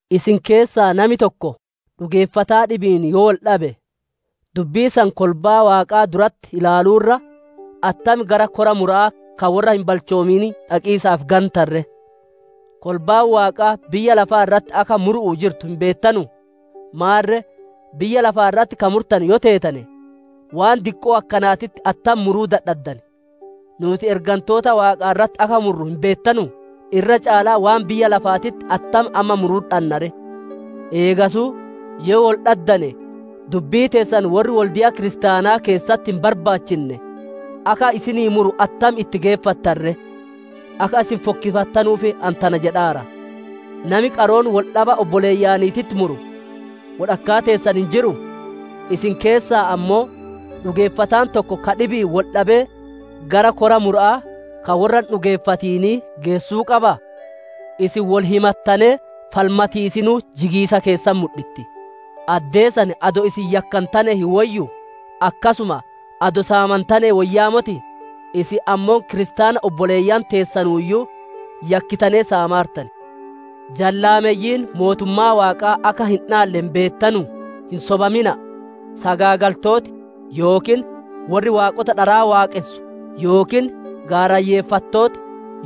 Isin keessaa nami tokko dhugeeffataa dhibi'iin yoo wol dhabe, dubbii san kolbaa Waaqaa duratti ilaaluu irra, attam gara Kora Mura'aa ka worra hin balchoominii dhaqiisaaf gantan ree? Kolbaan Waaqaa biyya lafaa irratti akka muru'uu jirtu hin beettanuu? Maarre, biyya lafaa irratti ka murtanu yoo teetane, waan diqqoo akkanaatitti attam muruu dadhaddan? Nuuti ergantoota Waaqaa irratti akka murru hin beettanuu? Irra caalaa waan biyya lafaatitti attam amma muruu dhanna ree? Eegasuu yoo wol dhaddane dubbii teessan worri wolde'a kiristaanaa keessatti hin barbaachinne akka isinii muru attam itti geeffattan ree? Akka isin fokkifattanuuf ani tana jedhaara. Nami qaroon wol dhaba obboleeyyaniititti muru wodhakkaa teessan hin jiruu? Isin keessaa ammoo dhugeeffataan tokko ka dhibi'iin wol dhabee gara Kora Mura'aa ka worra hin dhugeeffatinii geessuu qabaa? Isin wol himattanee falmatiisinuu jigiisa keessan mudhitti. Addee san adoo isin yakkantanee hin woyyuu? Akkasuma adoo saamantanee woyyaa motii? Isin ammoo kiristaana obboleeyyan teessanuuyyuu yakkitanee saamaartan. Jallaameyyiin Mootummaa Waaqaa akka hin dhaalle hin beettanuu? Hin sobamina'a! Sagaagaltooti yookiin worri waaqota dharaa waaqonsu, yookiin gaarayyeffattooti,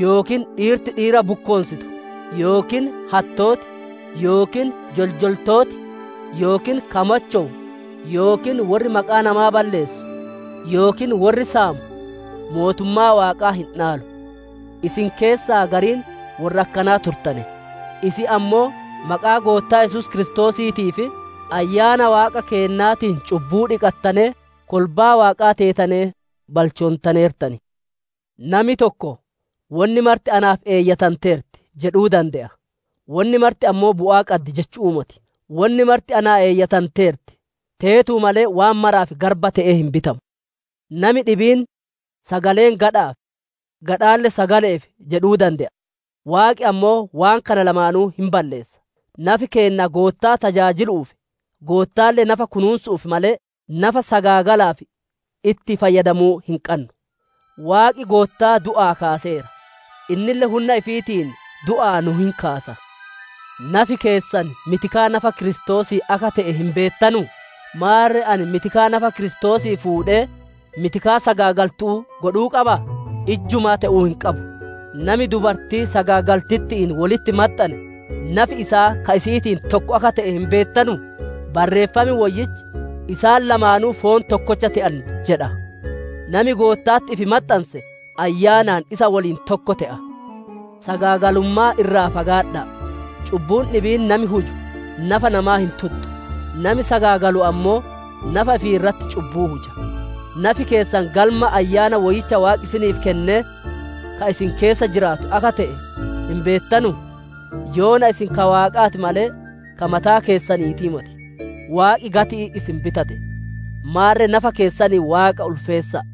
yookiin dhiirti dhiira bukkoonsitu, yookiin hattooti yookiin joljoltooti, yookiin ka machowu yookiin worri maqaa namaa balleessu, yookiin worri saamu Mootummaa Waaqaa hin dhaalu. Isin keessaa gariin worra akkanaa turtane. Isin ammoo maqaa Goottaa Yesuus Kiristoosiitii fi Ayyaana Waaqa keennaatiin cubbuu dhiqattanee, kolbaa Waaqaa teetanee balchoontaneertan. Nami tokko «Wonni marti naaf eeyyatanteerti» jedhuu dande'a. Wonni marti ammoo bu'aa qaddi jechu'uu moti. Wonni marti naa eeyyatanteerti, teetuu malee waan maraaf garba te'ee hin bitamu. Nami dhibiin, «Sagaleen gadha'aaf, gadhaalle sagale'eef» jedhuu dande'a. Waaqi ammoo waan kana lamaanuu hin balleessa. Nafi keenna Goottaa tajaajilu'uuf, Goottaalle nafa kunuunsu'uuf malee, nafa sagaagalaaf itti fayyadamuu hin qannu. Waaqi Goottaa du'aa kaaseera; innille hunna ifiitiin du'aa nu hin kaasa. Nafi keessan mitikaa nafa Kiristoosii akka te'e hin beettanuu? Maarre ani mitikaa nafa Kiristoosii fuudhee mitikaa sagaagaltu'uu godhuu qabaa? Ijjumaa te'uu hin qabu! Nami dubartii sagaagaltitti'iin wolitti maxxane nafi isaa ka isi'iitiin tokko akka te'e hin beettanuu? Barreeffam Woyyichi, «Isaan lamaanuu foon tokkocha te'an» jedha. Nami Gootta'atti ifi maxxanse ayyaanaan isa woliin tokko te'a. Sagaagalummaa irraa fagaadha'a. Cubbuun dhibiin nami huju nafa namaa hin tuxxu; nami sagaagalu ammoo nafa ifii irratti cubbuu huja. Nafi keessan galma Ayyaana Woyyicha Waaqi isiniif kennee, ka isin keessa jiraatuu akka te'e hin beettanuu? Yoona isin ka Waaqaa ti malee ka mataa keessaniitii moti. Waaqi gati'iin isin bitate. Maarre nafa keessaniin Waaqa ulfeessa'a.